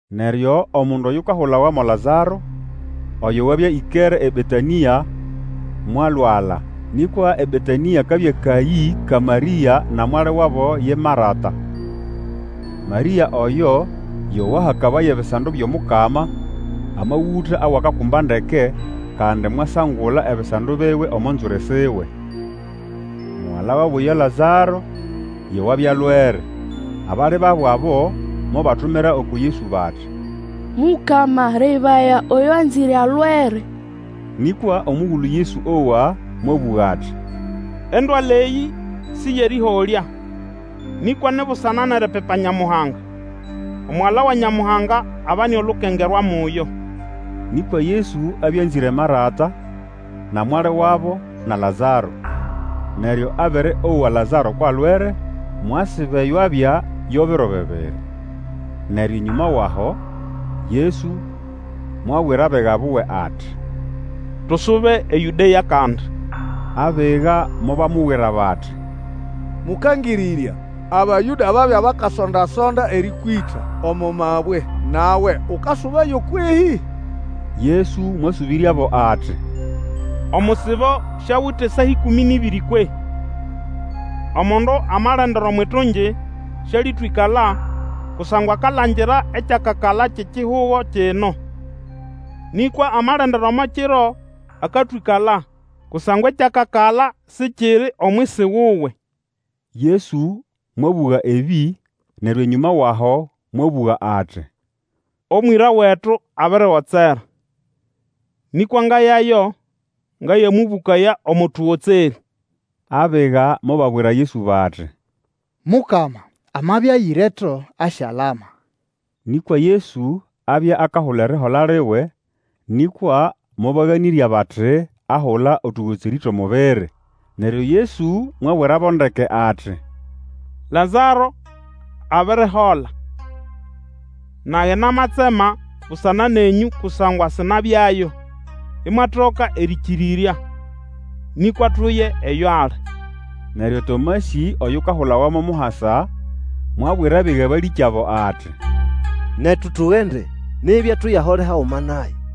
Neryo omundu oyukahulawa mo Lazaro, oyo wabya ĩkere eBetanĩa, mwalwala. Nĩkwa eBetanĩa kabya kayĩ ka Marĩa na mwali wabo ye Marata. Marĩa oyo yo wahakabaya ebisando byʼomukama amagũta awakakumba ndeke, kandi mwasangula ebisando biwe omo nzwiri siwe. Mugala wabo ye Lazaro yo wabya alwere. Abali babo abo mobatumira uku Yesu bati, Mukama, lebaya, oyo wanzĩre alwere. Nĩkwa omugulu Yesu owa, mwabũga ati, Endwala eyĩ si yʼerĩholya, nĩkwa ni busana nʼeripipa Nyamuhanga, Omugala wa Nyamuhanga abane olukengerwa muyo. Nĩkwa Yesu abya anzĩre Marata, na mwali wabo, na Lazaro. Neryo abere owa Lazaro kwʼalwere, mwasiba eyo abya yo biro bibiri. Neryo enyũma wʼaho Yesu mwabwira abiga buwe ati, Tusube eYũdea kandi. Abiga mobamubwira bati, Mũkangĩrĩrya, Abayũda babya bakasonda-sonda erĩkwĩta omo mabwe, nawe ukasubayo kwehĩ? Yesu mwasũbĩryabo ati, Omusibo siawite saa ĩkũmĩ nʼĩbĩrĩ kwehĩ? Omundu amalendera omwʼitungi, syalĩtwĩkala kusangwa akalangira ekyakakala kyʼekihugo kino. Nĩkwa amalendera omo kiro, akatwĩkala, kusangwa ekyakakala sikiri omwisi wuwe. Yesu mwabũga ebĩ, neryo enyũma wʼaho mwabũga ati, Omwĩra wetu abirigotsera; nĩkwa ngayayo ngayamũbũkaya omo tũgotserĩ. Abiga mobabwira Yesu bati, Mukama, amabya ayĩreto, asyalama. Nĩkwa Yesu abya akahula erihola liwe; nĩkwa mobaganĩrya bati ahula otũgotserĩ twʼomubiri. Neryo Yesu mwabwirabo ndeke ati, Lazaro abirihola. Nage namatsema busana nenyũ kusangwa sinabyayo, imwatoka erĩkĩrĩrya. Nĩkwa tuye eyo ali. Neryo Tomasĩ, oyukahulawa mo Muhasa, mwabwira abiga balĩkyabo ati, Netu tugende, nibya tuyahole haguma naye.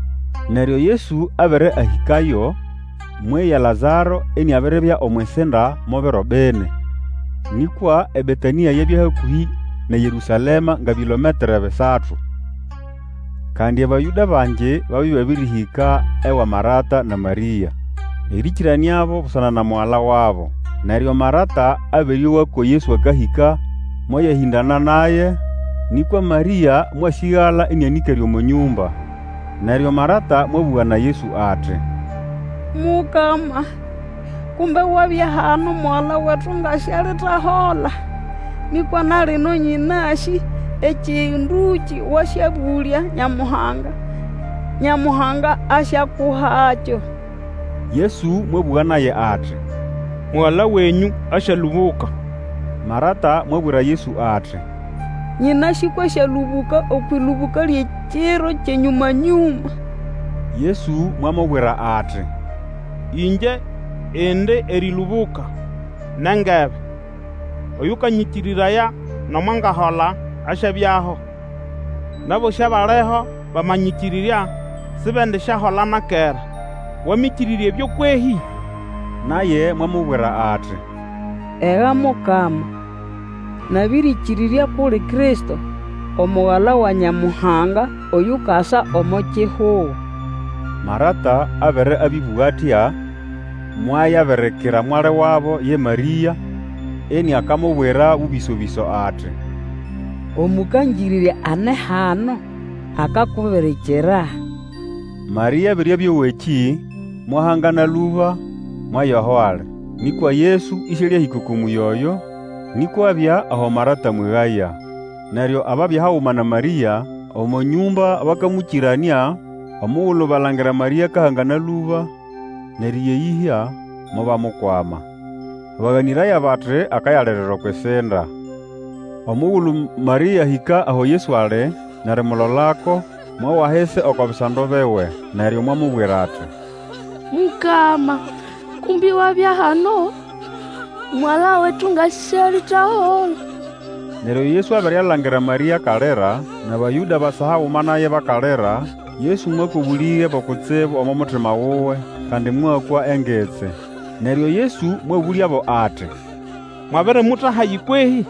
Neryo Yesu abere ahĩkayo, mweya Lazaro iniabiribya omwʼisinda mo biro bini. Nĩkwa eBetanĩa yabya hakũhĩ nʼeYerũsalema nga bilometre bisatu. Kandi Abayũda bangi babya ĩbabĩrĩhĩka ewa Marata na Marĩa, erĩkĩranĩabo busana na mugala wabo. Neryo Marata abere owa ko Yesu akahĩka, mwayahĩndana naye, nĩkwa Marĩa mwasĩgala ĩnĩanĩkere omo nyũmba. Neryo Marata mwabũga na Yesu ati, Mukama kumbe wabya hano, mugala wetu nga sialitahola! Nĩkwa na lino nyĩnasĩ ekĩndũkĩ wasyabũlya Nyamuhanga, Nyamuhanga asyakuhakyo. Yesu mwabũga naye ati, Mugala wenyũ asyalũbũka. Marata mwabwira Yesu ati, Nyĩnasĩ kwʼasyalũbũka okwʼĩlũbũka lyʼekiro kyʼenyũma-nyũma. Yesu mwamubwira ati, Ingye indi erĩlũbũka, nʼengebe. Oyũkanyĩkĩrĩraya nomo angahola asyabyaho. Nʼabosĩ abaliho bamanyĩkĩrĩrya sibendisyahola na kera. Wamĩkĩrĩrya ebyo kwehĩ? Naye mwamubwira ati, Ega Mukama! Nabĩrĩkĩrĩrya kʼuli Kristo, Omugala wa Nyamuhanga, oyukasa omo kihugo. Marata abere abĩbũga atya, mwayabirikira mwali wabo ye Marĩa, iniakamubwira bũbĩso-bĩso ati, Omũkangĩrĩrya ane hano, akakubirikira. Marĩa abere abĩowa ekĩ, mwahangana lũba, mwaya aho ali. Nĩkwa Yesu ĩsĩalĩahĩka oko mũyĩ oyo, nĩkwa abya aho Marata amwegaya. Neryo ababya haguma na Marĩa omo nyũmba bakamũkĩranĩa, omugulu balangira Marĩa akahangana lũba nʼeriya eyĩhya, mobamukwama. Baganĩraya bati akayalirira okwʼisinda. Omugulu Marĩa ahĩka aho Yesu ali, nʼerimulolako, mwawa ahisi oko bisando biwe. Neryo mwamubwira ati, Mukama, kumbe wabya hano, mugala wetu nga sialitahola! Neryo Yesu abere alangira Marĩa akalira, nʼAbayũda abasa haguma naye bakalira, Yesu mwakwa obũlĩge bo kutsibu omo mutima wuwe, kandi mwakwa engitsi. Neryo Yesu mwabũlyabo ati, Mwabirimuta hahi kwehĩ?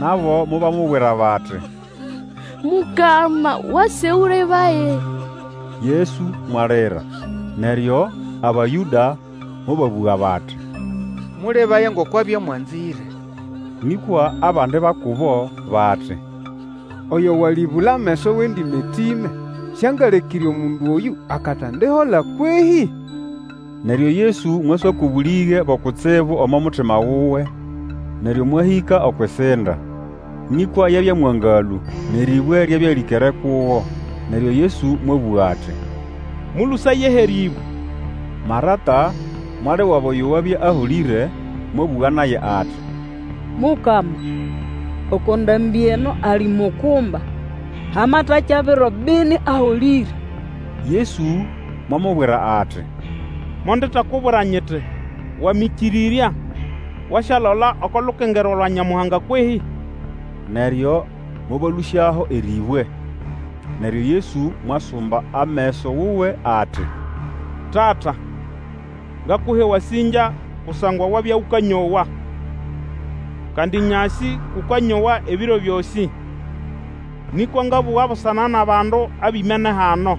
Nabo mobamubwira bati, Mukama, wase Ũlebaye. Yesu mwalira. Neryo Abayũda mobabũga bati, Mũlebaye ngoko abya amwanzĩre. Nĩkwa abandi ba kubo bati, Oyo walĩbũla ameso wʼendĩmatĩme, Sĩangalekĩre omundu oyũ akatendihola kwehĩ? Neryo Yesu mwaswakwa obũlĩge bo kutsibu omo mutima wuwe, neryo mwahĩka okwʼisinda. Nĩkwa yabya mwangalũ nʼerĩbwe ryabya lĩkere kugo. Neryo Yesu mwabũga ati, Mũlũsayeho erĩbwe. Marata, mwali wabo oyo wabya aholĩre mwabũga naye ati, Mukama, oko ndambĩ eno alimukumba. Hamatakya biro bini aholĩre. Yesu mwamubwira ati, Mondetakubwira nyiti, Wamĩkĩrĩrya, wasyalola oko lukengerwa lwa Nyamuhanga kwehĩ? Neryo mobalũsyaho erĩbwe. Neryo Yesu mwasumba ameso wuwe ati, Tata, ngakuha ewasĩngya kusangwa wabya ũkanyowa. Kandi nyasĩ kʼũkanyowa ebiro byosĩ, nĩkwa ngabũga busana nʼabandu abimene hano,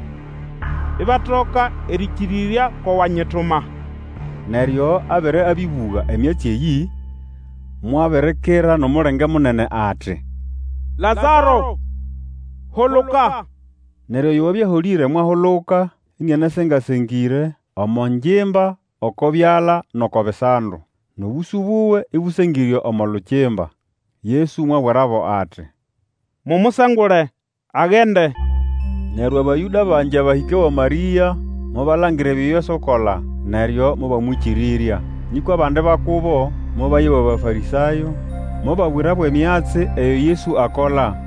ibatoka erĩkĩrĩrya ko wanyituma. Neryo abere abĩbũga emyatsi eyĩ, mwabirikira nʼomulenge munene ati, Lazaro, huluka! Neryo oyo wabya aholĩre mwahuluka inianasenga-sengĩre omo ngimba oko byala nʼoko bisando, nʼobũsũ buwe ĩbũsengĩre omo lukimba. Yesu mwabwirabo ati, Mumusengule, agende. Neryo Abayũda bangi abahĩka ewa Marĩa, mobalangira ebyo Yesu akola, neryo mobamwĩkĩrĩrya. Nĩkwa abandi ba kubo mobaya ewa Bafarĩsayo, mobabwirabo emyatsi eyo Yesu akola.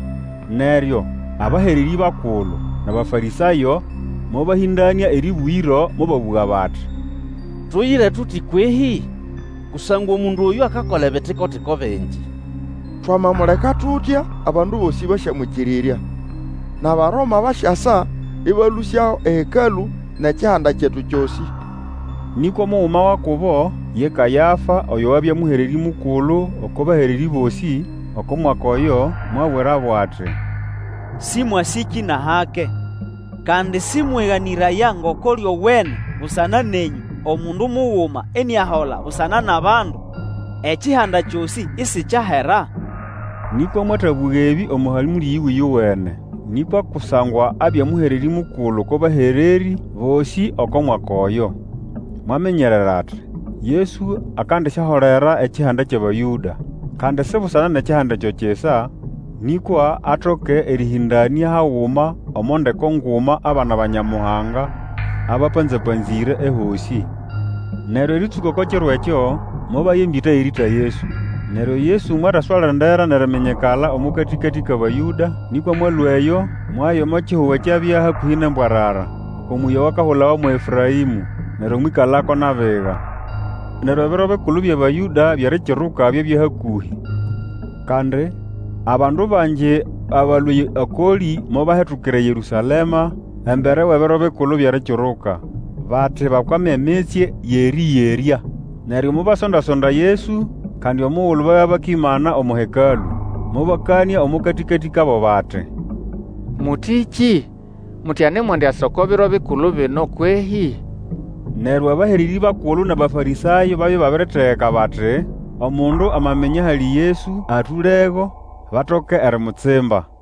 Neryo abahererĩ bakulu nʼAbafarĩsayo mobahĩndanĩa erĩbũgĩro, mobabũga bati, Tuyire tuti kwehĩ? Kusangwa omundu oyũ akakola ebitiko-tiko bingi. Twamamuleka tutya, abandu bosĩ basyamwĩkĩrĩrya, nʼAbaroma basyasa ĩbalũsyaho eHekalũ nʼekihanda kyetu kyosĩ. Nĩkwa omuguma wa kubo, ye Kayafa, oyo wabya Mũhererĩ Mukulu oko bahererĩ bosĩ oko mwaka oyo, mwabwirabo ati, Sĩmwasĩkĩ nʼahake! Kandi sĩmweganĩraya ngoko lyowene busana nenyũ, omundu muguma iniahola busana nʼabandu, ekihanda kyosĩ isikyahera. Nĩkwa mwatabũga ebĩ omo hamũlĩ yiwe ĩyowene, nĩkwa kusangwa abya Mũhererĩ Mukulu oko bahererĩ bosĩ oko mwaka oyo, mwaminyerera ati, Yesu akandisyaholera ekihanda kyʼAbayũda. Kandi si busana nʼekihanda ekyo kisa, nĩkwa atoke erĩhĩndanĩa haguma omo ndeko nguma abana ba Nyamuhanga abapanza-panzĩre ehosĩ. Neryo erĩtsũka oko kiro ekyo, mobaya embĩta yʼerĩĩta Yesu. Neryo Yesu mwataswalendera nʼeriminyikala omo katĩkatĩ kʼAbayũda, nĩkwa mwalũa eyo, mwaya omo kihugo ekyabya hakũhĩ nʼembwarara, oko mũyĩ owakahulawa mo Efũraĩmũ, neryo mwĩkalako nʼabiga. Neryo Ebiro Bikulu byʼAbayũda byʼErikiruka byabya hakũhĩ, kandi, abandu bangi abalũa okolĩ mobahetukira eYerũsalema embere wʼEbiro Bikulu byʼErikiruka, bati bakwame emitsye yʼerĩyerya. Neryo mobasonda-sonda Yesu, kandi omugulu babya bakimana omo Hekalũ, mobakanĩa omo katĩkatĩ kabo bati, Mũtĩkĩ? Muti anemwendiasa oko Biro Bikulu bino kwehĩ? Neryo abahererĩ bakulu nʼAbafarĩsayo babya ibabiritegeka bati omundu amaminya ahali Yesu, atũlego, batoke erimutsimba.